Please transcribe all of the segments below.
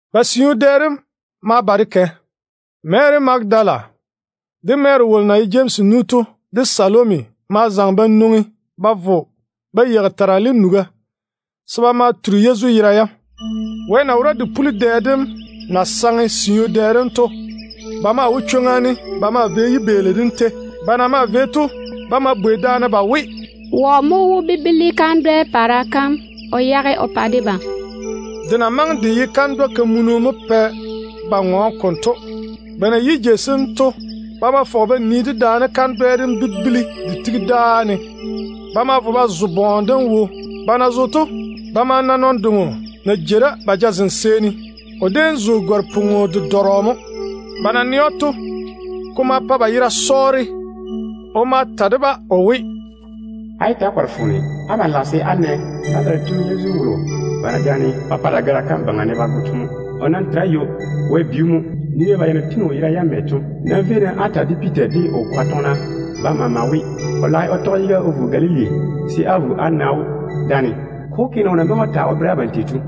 Ba siu dɛ dem ma ba de kɛ. Mary Magadala, de Mary wolo na ye Jemsi nu to, de Salomi ma zaŋe ba nwoŋi ba vo ba yeigi terale nuga se ba ma turi Yezu yera yam. Wɛ na wora de puli dɛ dem na saŋe siu dɛ dem to, Ko kuri mo ye ‘Sunday’ tetete. ba maa wo chwoŋa ne ba maa vei yibeeli dem ni. Ba na maa kɛ to, ba ma bwei daane ba we, “Wɔ mo wó bibili kandwɛ-kamunu kom o yage o pa debam?” Kandwɛ dem na maŋe de ye kamunu to mo pɛ ba ŋɔɔne konto. Ba na yi jei sem to, ba ma fɔge ba nii dedaane kandwɛ dem bibili de tigi dáa ne. Ba ma vo ba zo bɔɔne dem wo. Ba na zo to, ba ma na nɔn-doŋo na jei da ba jazem seeni. O déem zo gare-pwon-dedɔrɔ mo. Ba na nɛ‑o to, ko ma pa ba yera sɔɔre. O ma ta de-ba o we, “Yé ta‑á kɔre-na foone. Abam lage se á na Nazarete tu Yezu wolo ba na jaane ba pa dagara kam yuu ne ba go to mo. O nam tere ywo. Wɛ bi‑o mo. Nii-na ba ya na tiŋi o yera yam mɛ to. Nam véi-na á ta de Piita de o kwaga tɔgena bam maama we, o lage o tɔge yiga o vo Galili se á vo á na‑o dáane. Ko wó ke ne o na maŋe o ta o bere abam tei to.”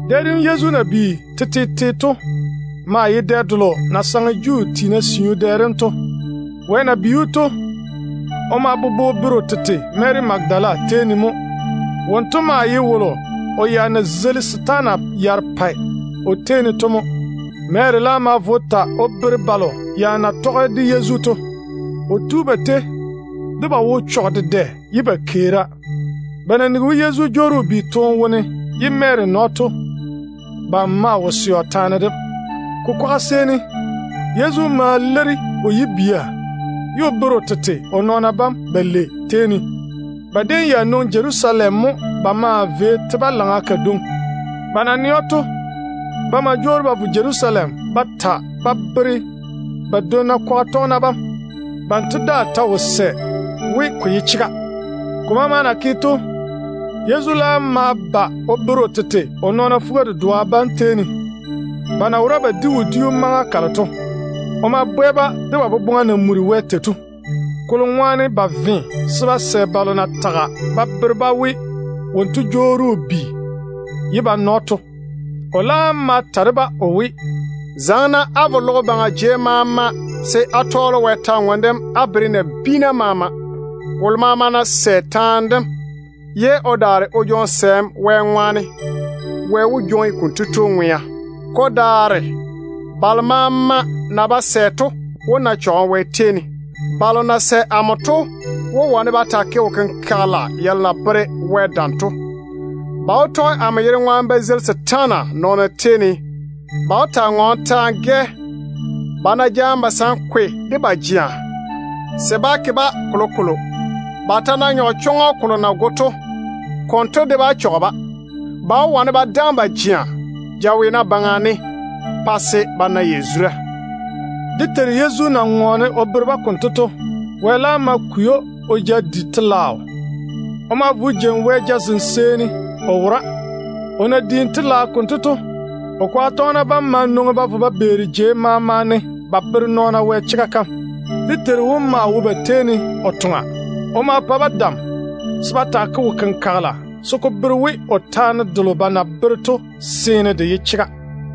Dɛ dem Yezu na bi tetete to maa ye dɛ delo na saŋe Juu tiina siu dɛ dem to. wo popone ko tiŋi tɔn-dwonnu tem maama wone. Wɛ na bi‑o to, o ma bobo o bere o tete Mary Magadala tei ne. Wonto maa ye wolo o ya na zeili setaana yarepɛ o tei ne to mo. Mary laam ma vo o ta o bere balo ya na me de Yezu to. O tu ba tei de ba wo chɔge dedɛ ye ba keera. Ba na nigi we Yezu jwoori o bi toone wone ye Mary na‑o to, ba maa wo sɛ o taane dem. Ko kwaga seeni, Yezu ma leiri o yibia ye o bere o tete o nɔɔna bam balei tei ne. Ba déem ya nwoŋi Jerusalem mo ba maa vei te-balaŋa kadwoŋi. Ba na nɛ‑o to, ba ma jwoori ba vo Jerusalem ba ta ba bere ba dwonna kwaga tɔgena bam. Banto daa ta wo sɛ we ko ye chega. Ko maama na ke to, Yezu laam ma ba o bere o tete o nɔɔna fuga-dedoa bam tei ne, ba na wora ba di wodiu maŋa kalo to. O ma bwɛ-ba de ba boboŋa na muri Wɛ tei ne, kolo ŋwaane ba ve se ba sɛ balo na tage ba bere-ba we wonto jwoori o bi ye ba na‑o to. O laam ma ta de-ba o we, “Zaŋe-na á vo logo baŋa jei maama se á tɔɔle Wɛ kwor-ywoŋa kam á bere nabiina maama. Wolo maama ná sɛ taane dem ye o daare o jwoŋi sɛɛm Wɛ ŋwaane, Wɛ wó jwoŋi konto tu ŋwea. Ko daare balo maama na ba sɛ to wó ga bora Wɛ yiga ne. Balo na sɛ amo to wó wane ba taa ke wo-kenkagela yalo na bere Wɛ dam to. Ba wó tɔge amo yere ŋwaane ba zeili setaana nɔɔna tei ne. Ba wó taa ŋɔɔne ta-gɛ. Ba ná jaane basankwe de ba jea, se bá ke-ba kolokolo. Ba ta ná nyɔge chɔŋɔ kolo na goe nɔɔna to, konto de bá chɔge-ba. Ba wó wane ba daŋe ba jea jaweena baŋa ne pa se ba na yazura.” Dé Teiru Yezu na ŋɔɔne o bere-ba konto to, Wɛ laam ma kwei‑o o ja di telaao. O ma vo o jeini Baŋa Wɛ jazem seeni o wora. O na diini telaao konto to, o kwaga tɔgena bam ma nwoŋi ba vo ba beeri jei maama ne ba bere nɔɔna Wɛ chega kam. Dé Teiru wom maa wo ba tei ne o toŋa. O ma pa-ba dam se ba taa ke wo-kenkagela se ko bere we o taane delo ba na bere to seene de ye chega.]